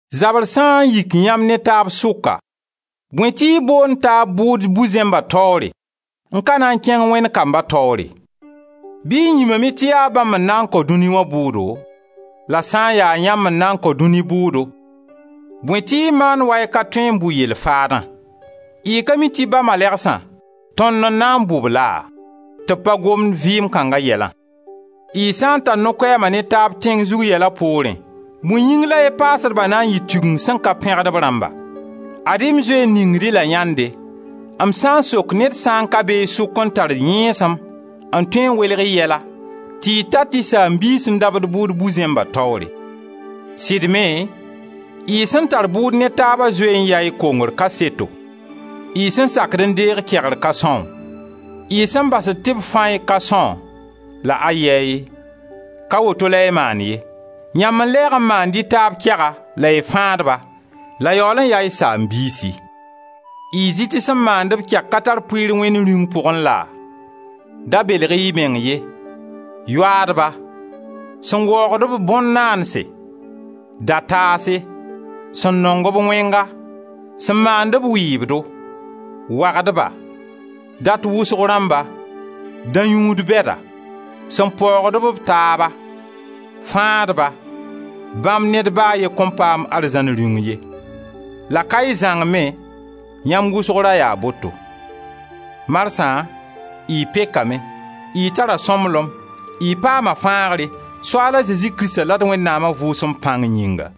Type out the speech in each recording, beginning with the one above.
Zabr sã n yik yãmb ne taab sʋka, bõe tɩ y boond taab bʋʋd bu-zẽmba taoore, n ka na n kẽng Wẽnd kamba taoore? Bɩ y yĩmame tɩ yaa bãmb n na n kao dũni wã bʋʋdo? La sã n ya yãmb n na n kao dũni bʋʋdo, bõe tɩ y maand wa y ka tõe n bʋ yell faadã? Y ka mi tɩ ba malɛgsã, tõnd n na n bʋ-b laa? Tɩ b pa gomd vɩɩm kãnga yɛlã! Y sã n tar no-koɛɛm ne taab tẽng zug yɛla poorẽ, bõe yɩng la y paasdba na n yɩ Tigengu sẽn ka pẽgd b rãmba? Ad-y m zoe n ningd-y la yãnde m sã n sok ned sã n ka be y sʋka n tar yẽesem n tõe n welg y yɛla, tɩ y tat y saam-biis n dabd bʋʋd bu-zẽmba taoore! Sɩd me, y sẽn tar bʋʋd ne taaba zoe n yaa y kongr kaseto. Y sẽn sakd n deeg kegr ka são? Y sẽn basd tɩ b fã-y ka são? La ayɛy! Ka woto la y maand ye; yãmb n lɛɛg n maand y taab kɛga la y fãad-ba, la yaool n yaa y saam-biisi! Y zɩ tɩ sẽn maand-b kɛg ka tar pʋɩɩr Wẽnd Rĩung pʋgẽ laa? Da belg-y y meng ye: yoaadba, sẽn waoogd-b bõn-naandse, dataase, sẽn nong-b wẽnga, sẽn maand-b wɩɩbdo, wagdba, dat-wʋsg-rãmba, dã-yũud bɛda, sẽn paoogd-b taaba, fãadba, bãmb ned ba a ye kõn paam Arzãn Rĩung ye. La ka y zãng me, yãmb wʋsg ra yaa boto. Marsã y pekame, y tara sõmblem, y paama fãagre, Soaal a Zezi Krista la d Wẽnnaama Vʋʋsem pãng yĩnga.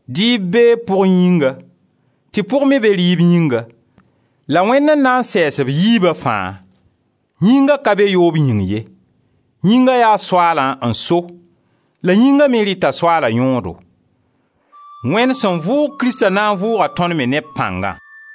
Dɩɩb bee pʋg yĩnga, tɩ pʋg me be rɩɩb yĩnga la Wẽnd n na n sɛɛs b yiiba fãa. Yĩnga ka be yoob yĩng ye; yĩnga yaa Soaalã n so, la yĩnga me rɩta Soaala yõodo. Wẽnd sẽn vʋʋg Krista na n vʋʋga tõnd me ne b pãngã.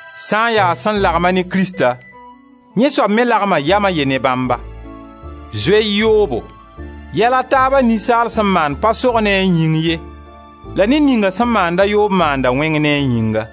Sã n ya sẽn lagma ne Krista, yẽ soab me lebga yam a ye ne Bãmba. Zoe-y yoobo! Yɛl a taaba ninsaal sẽn maand pa sog ne a yĩng ye la ned ninga sẽn maanda yoob maanda wẽng ne a yĩnga.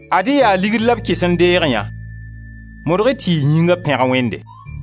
Ad-y yaa ligd la b kɩs n deeg yã! Modg-y tɩ y yĩnga pẽg Wẽnde.